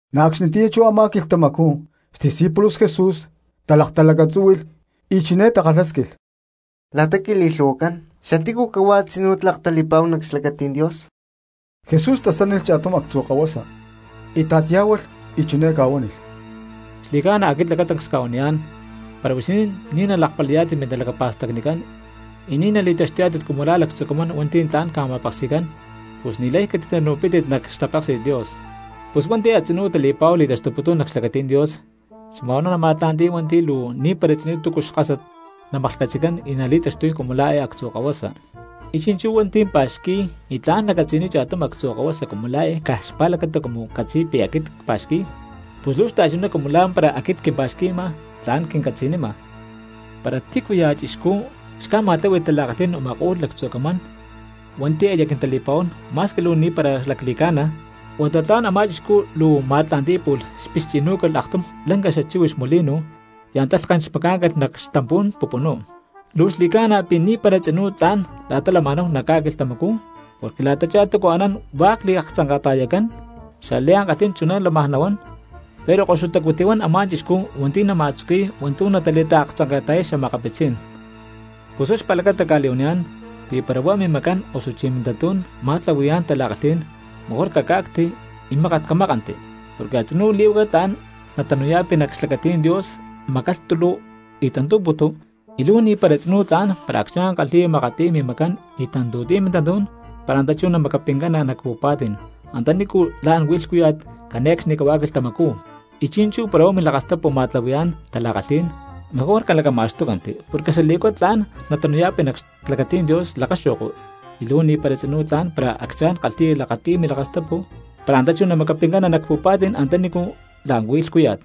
Na̠ acxnitiyá chú a̠má quilhtamacú xdiscípulos Jesus talaktalacatzúhui̠lh y chiné takalhásquilh: —La̠ta quili̠lhu̠huacán, ¿xatícu cahuá a̠tzinú tlak tali̠pa̠hu nac xlacatí̠n Dios? Jesús tasánilh cha̠tum actzu kahuasa, íta̠t yá̠hualh y chiné ca̠huánilh: —Xli̠ca̠na aquit lacatancs cca̠huaniyá̠n, para pi̠ huixinín ni̠ nalakpali̠yá̠tit mintalacapa̠stacnicán y ni̠ nali̠taxtuyá̠tit cumu la̠ lactzu camán hua̠nti̠ tla̠n ca̠ma̠peksi̠cán, pus ni̠lay catitanu̠pítit nac xtapéksi̠t Dios. Pus hua̠nti̠ a̠tzinú tali̠pa̠hu li̠taxtuputún nac xlacatí̠n Dios xma̠nhuá nama̠tla̠nti̠y hua̠nti̠ luu ni̠para tzinú túcu xkásat namaklhcatzi̠cán y nali̠taxtuy cumu la̠ eé actzu kahuasa. Y chi̠nchú hua̠nti̠ pa̠xqui̠y y tla̠n nacatzi̠niy cha̠tum actzu kahuasa cumu la̠ eé caj xpa̠lacata cumu catzi̠y pi̠ aquit cpa̠xqui̠y pus luu xta̠chuná cumu la̠mpara aquit quimpa̠xqui̠ma y tla̠n quincatzi̠nima. ’Para tícuya̠ cristiano xca̠ma̠tláhui̠lh tala̠kalhí̠n u̠ma̠ko̠lh lactzu camán hua̠nti̠ aya quintali̠pa̠huán ma̠squi luu ni̠para lacli̠ca̠na, huata tlan a̠má chixcú luu ma̠tla̠nti̠y pu̠lh xpixchi̠nú̠calh aktum lanca xachíhuix molino y antá lhken xmacá̠ncalh nac xtampú̠n pupunú. Luu xli̠ca̠na pi̠ ni̠para tzinú tla̠n la̠ta lama̠náhu nac ca̠quilhtamacú, porque la̠tachá túcu anán hua̠k li̠laktzanka̠ta̠yacán; xliankalhí̠n chuná lámaj nahuán, pero ¡koxutacu tihuán a̠má chixcú hua̠nti̠ nama̠tzuqui̠y hua̠ntu̠ natali̠laktzanka̠ta̠yay xa̠makapitzí̠n! ’Pus huá xpa̠lacata cli̠huaniyá̠n pí para huá mimacán osuchí mintantú̠n ma̠tlahui̠yá̠n tala̠kalhí̠n, mejor caca̠cti y mákat camákanti; porque a̠tzinú lí̠huaca tla̠n natanu̠ya̠pi nac xlacatí̠n Dios macalhtulu y tantú̠putu, y luu ni̠para tzinú tla̠n para acchá̠n kalhi̠ya makatiy mimacán y tantu̠tiy mintantú̠n para antá chú namacapincana nac pu̠pa̠tí̠n antanícu la̠n huí lhcúya̠t cane̠cxnicahuá quilhtamacú. Y chi̠nchú para huá milakastapu ma̠tlahui̠yá̠n tala̠kalhí̠n, mejor calacatamacxtúcanti porque xalí̠huaca tlá̠n natanu̠ya̠pi nac xlacatí̠n Dios lakaxo̠ko y luu ni̠para tzinú tla̠n para acchá̠n kalhi̠ya lakati̠y milakastapu para antá chú namacapincana nac pu̠pa̠tí̠n antanícu la̠n huí lhcúya̠t.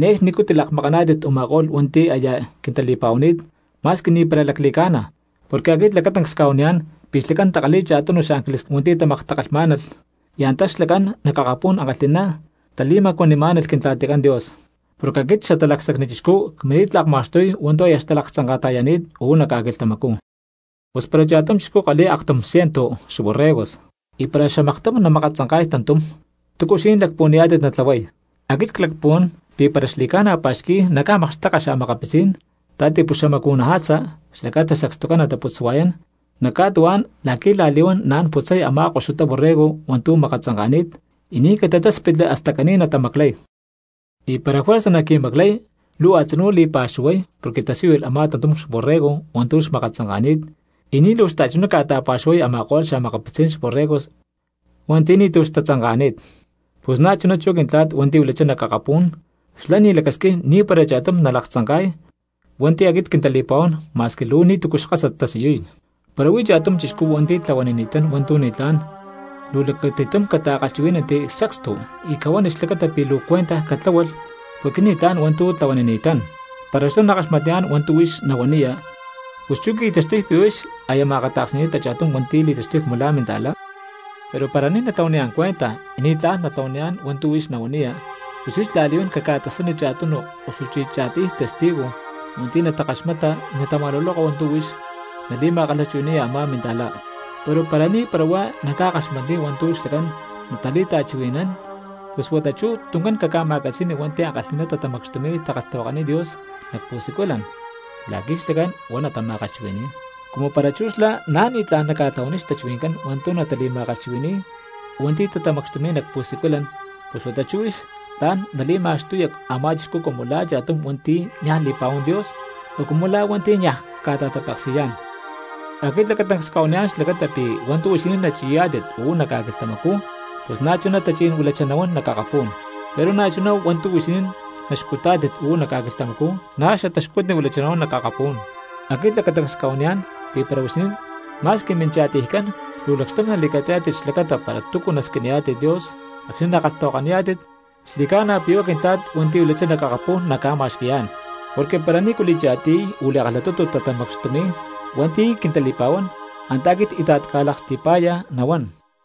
’Ne̠cxnicú tilakmakaná̠tit u̠ma̠ko̠lh hua̠nti̠ aya quintali̠pa̠huani̠t ma̠squi ni̠para lacli̠ca̠na, porque aquit lacatancs cca̠huaniyá̠n pi̠ xlacán takalhi̠y cha̠tunu xángeles hua̠nti̠ tamaktakalhmá̠nalh, y antá xlacán nac akapú̠n ankalhi̠ná tali̠macuanimá̠nalh Quintla̠ticán Dios. Porque aquit Xatalacsacni Chixcú cmini̠t lakma̠xtuy hua̠nti̠ aya xtalaktzanka̠ta̠yani̠t uú nac ca̠quilhtamacú. ’Pus para cha̠tum chixcú kalhi̠y aktum ciento xborregos y para xamaktum namakatzanka̠y tantum, ¿túcu huixinín lacpuhuaniyá̠tit natlahuay? Aquit clacpuhuán pi̠ para xli̠ca̠na pa̠xqui̠y naca̠makxteka xa̠makapitzí̠n ta̠tipuxamacu̠naja̠tza xlacata sacstucán nataputswa̠yán nac ca̠tuhuá̠n la̠qui̠ la̠li̠huán naán putzay a̠má koxutá borrego hua̠ntu̠ makatzanka̠ni̠t, y ni̠ catitáspitli hasta caní natamaclay. Y para juerza naqui̠maclay luu a̠tzinú li̠pa̠xuhuay porque tasíyulh a̠má tantum xborrego hua̠ntu̠ xmakatzanka̠ni̠t, y ni̠ luu xta̠chuná ca̠ta̠pa̠xuhuay a̠ma̠ko̠lh xa̠makapitzí̠n xborregos hua̠nti̠ ni̠tu̠ xtatzanka̠ni̠t. Pus na̠ chuná chú Quintla̠t hua̠nti̠ huilachá nac akapú̠n xlá ni̠ lacasquín ni̠para cha̠tum nalaktzanka̠y hua̠nti̠ aquit quintali̠pa̠huán ma̠squi luu ni̠tu̠cu xkásat tasiyuy. ’Para huí cha̠tum minta̠cristiano hua̠nti̠ tlahuanini̠tán hua̠ntu̠ ni̠tlá̠n, luu lacati̠tum cata̠chuhuí̠nanti sacstu y cahuani xlacata pi̠ luu cuentaj catláhualh porque ni̠tlá̠n hua̠ntu̠ tlahuanini̠tán. Para xlá nakaxmatniyá̠n hua̠ntu̠ huix nahuaniya, pus chú qui̠taxtuy pi̠ huix aya ma̠akata̠ksni̠ni̠ta cha̠tum hua̠nti̠ li̠taxtuy cumu la̠ minta̠lá. Pero para ni̠ natlahuaniyá̠n cuenta y ni̠ tla̠n natlahuaniyá̠n hua̠ntu̠ huix nahuaniya, pus huix la̠li̠huán caca̠tasani cha̠tum osuchí cha̠tiy testigos hua̠nti̠ natakaxmata y natama̠luloka hua̠ntu̠ huix nali̠ma̠kalhchuhui̠ni̠ya a̠má cristiano. Pero para na̠ ni̠para huá naca̠kaxmatniy hua̠ntu̠ xlacán natali̠ta̠chuhui̠nán, pus huata chú tuncán caca̠ma̠catzi̠ni hua̠nti̠ ankalhi̠ná tatamacxtumi̠y takalhtahuakaniy Dios nac pu̠siculan la̠qui̠ xlacá̠n huá natama̠kalhchuhui̠ni̠y. Cumu para chú xlá na̠ ni̠tlá̠n naca̠tlahuaniy xtachuhui̠ncán hua̠ntu̠ natali̠ma̠kalhchuhui̠ni̠y hua̠nti̠ tatamacxtumi̠y nac pu̠siculan, pus huata chú huix tla̠n nali̠ma̠xtuya a̠má chixcú cumu lá cha̠tum hua̠nti̠ niaj li̠pa̠huán Dios, o cumu la̠ hua̠nti̠ niaj ca̠ta̠tapeksi̠yá̠n. ’Aquit lacatancs cca̠huaniyá̠n xlacata pi̠ hua̠ntu̠ huixinín nachi̠yá̠tit uú nac ca̠quilhtamacú, pus na̠chuná tachí̠n huilachá nahuán nac akapú̠n; pero na̠chuná hua̠ntu̠ huixinín naxcutá̠tit uú nac ca̠quilhtamacú na̠ xataxcutni huilachá nahuán nac akapú̠n. ’Aquit lacatancs cca̠huaniyá̠n pi̠ para huixinín ma̠squi mincha̠tiycán luu lacxtum nali̠catzi̠yá̠tit xlacata para túcu nasquiniyá̠tit Dios acxni̠ nakalhtahuakaniyá̠tit xli̠ca̠na pi̠ huá Quintla̠t hua̠nti̠ huilachá nac akapu̠n naca̠ma̠xqui̠yá̠n. Porque para nícu li̠cha̠tiy o li̠kalhatutu tatamacxtumi̠y hua̠nti̠ quintali̠pa̠huán antá aquit íta̠t cca̠laksti̠pa̠láyaj nahuán.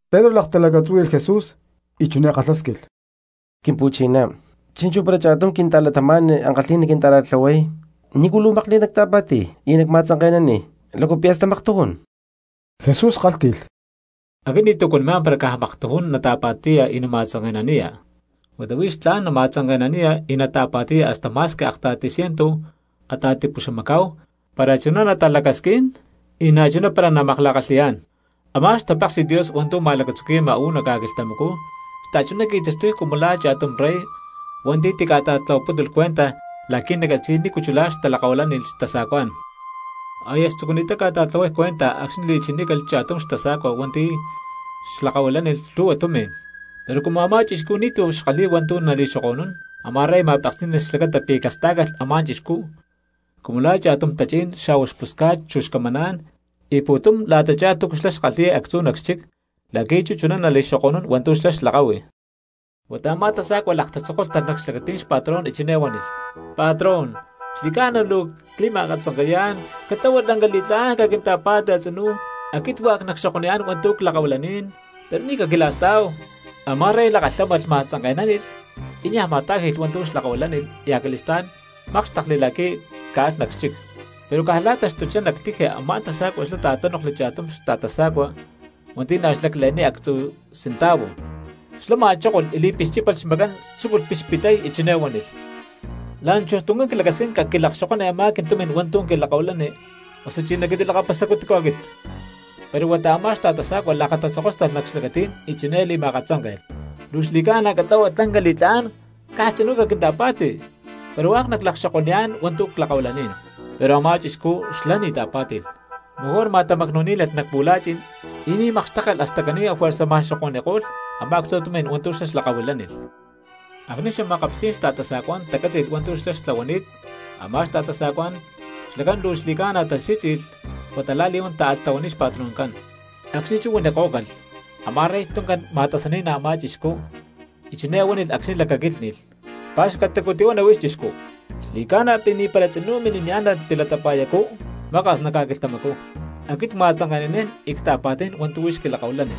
Pedro laktalacatzúhui̠lh Jesús y chiné kalhásquilh: —Quimpu̠chiná, chi̠nchú para cha̠tum quinta̠cristiano ankalhi̠ná quinta̠ra̠tlahuay, ¿nícu luu makli̠t nacta̠pa̠ti̠y y nacma̠tzanke̠naniy? ¿Lácu pi̠ hasta maktujún? Jesús kálhti̠lh: —Aquit ni̠tu̠ cuanimá̠n para caj maktujún nata̠pa̠ti̠ya y nama̠tzanke̠naniya, huata huix tla̠n nama̠tzanke̠naniya y nata̠pa̠ti̠ya hasta ma̠squi akta̠ti ciento a̠ta̠tipuxamacá̠hu para chuná natalacasquín y na̠chuná para namakla̠kalhi̠yá̠n. ’Amá xtapéksi̠t Dios hua̠ntu̠ ma̠lacatzuqui̠ma uú nac ca̠quilhtamacú xta̠chuná qui̠taxtuy cumu la̠ cha̠tum rey hua̠nti̠ tica̠ta̠tlahuapútulh cuenta la̠qui̠ nacatzi̠y nícu chulá talakahuilánilh xtasa̠cuá̠n. Aya xtzucuni̠ttá ca̠ta̠tlahuay cuenta acxni̠ li̠chinícalh cha̠tum xtasa̠cua hua̠nti̠ xlakahuilánilh lhu̠hua tumi̠n. Pero cumu a̠má chixcú ni̠tu̠ xkalhi̠y hua̠ntu̠ nali̠xoko̠nún, a̠má rey ma̠peksí̠nalh xlacata pi̠ castá̠calh a̠má chixcú cumu lá cha̠tum tachí̠n xa̠huá xpusca̠t chu xcamaná̠n, y pu̠tum la̠tachá túcu xlá xkalhi̠y actzú nac xchic la̠qui̠ chú chuná nali̠taxoko̠nún hua̠ntu̠ xlá xlakahui. Huata a̠má tasa̠cua lakatatzokóstalh nac xlacatí̠n xpatrón y chiné huánilh: “Patrón, xli̠ca̠na luu cli̠ma̠akatzanke̠yá̠n catlahua lanca li̠tlá̠n caquinta̠pa̠ti a̠tzínu. Aquit hua̠k nacxokoniyá̠n hua̠ntu̠ clakahuilanín, pero ni̠ caquila̠stá̠hu.” Amá rey lakalhámalh ma̠tzanke̠nánilh y niaj ma̠tá̠ji̠lh hua̠ntu̠ xlakahuilánilh y acali̠stá̠n mákxtekli la̠qui̠ caalhá nac xchic. Pero caj la̠ta taxtuchá nac tiji a̠má tasa̠cua xlá ta̠tánoklhli cha̠tum xta̠tasa̠cua hua̠nti̠ na̠ xlacle̠niy actzu cintavu. Xlá ma̠chókolh y li̠pixchípalh xmacán tzúculh pixpitay y chiné huánilh: “La̠nchujtuncán clacasquín caquilakxokoni a̠má quintumi̠n hua̠ntu̠ quilakahuilani osuchí naquintilakapasacú tícu aquit.” Pero huata a̠má xta̠tasa̠cua lakatatzokóstalh nac xlacatí̠n y chiné li̠ma̠katzánke̠lh: “Luu xli̠ca̠na catlahua lanca li̠tlá̠n caj a̠tzinú caquinta̠pa̠ti, pero hua̠k naclakaxokoniyá̠n hua̠ntu̠ clakahuilanín.” Pero a̠má chixcú xlá ni̠ ta̠pá̠ti̠lh, mejor ma̠tamacnu̠ní̠nalh nac pu̠la̠chi̠n y ni̠ makxtékcalh hasta caní afuerza ma̠xoko̠ni̠ko̠lh a̠má actzu tumi̠n hua̠ntu̠ xlá xlakahuilánilh. Acxni̠ xa̠makapitzí̠n xta̠tasa̠cuá̠n tacátzi̠lh hua̠ntu̠ xlá xtlahuani̠t a̠má xta̠tasa̠cuacán xlacán luu xli̠ca̠na tali̠sí̠tzi̠lh huata la̠li̠huán táalh tahuaniy xpatroncán. Acxni̠ chú huanikó̠calh, a̠má rey tuncán alh ma̠tasani̠nán a̠má chixcú y chiné huánilh acxni̠ lacaquílhni̠lh: “Pa̠xcatacu tihuana huix chixcú. Xli̠ca̠na pi̠ ni̠para tzinú mini̠niyá̠n natilatapa̠yacú maka̠s nac ca̠quilhtamacú. Aquit cma̠tzanke̠nanín y cta̠pa̠tí̠n hua̠ntu̠ huix xquilakahuilani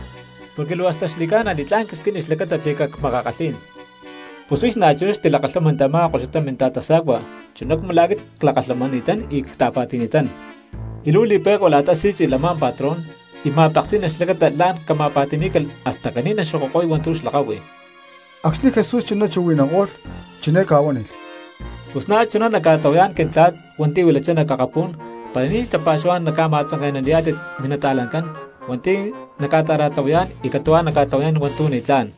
porque luu hasta xli̠ca̠na li̠tlá̠n quisquini xlacata pi̠ cacmakakalhí̠n. Pus huix na̠chuná xtilakalhámanti a̠má koxutá minta̠tasa̠cua chuná cumu la̠ aquit clakalhamani̠tán y cta̠pa̠ti̠ni̠tán.” Y luu li̠pe̠cua la̠ta sí̠tzi̠lh a̠má patrón y ma̠peksí̠nalh xlacata la̠n cama̠pa̠ti̠ní̠calh hasta caní naxokoko̠y hua̠ntu̠ xlakahui. Acxni Jesús chuná chuhui̠nanko̠lh chiné ca̠huánilh: —Pus na̠chuná naca̠tlahuayá̠n Quintla̠t hua̠nti̠ huilachá nac akapú̠n para ni̠ ya̠ tapa̠xuhuá̠n nama̠tzanke̠naniyá̠tit minta̠cristianojcán hua̠nti̠ naca̠ta̠ra̠tlahuayá̠n y catu̠huá naca̠tlahuaniyá̠n hua̠ntu̠ ni̠tlá̠n.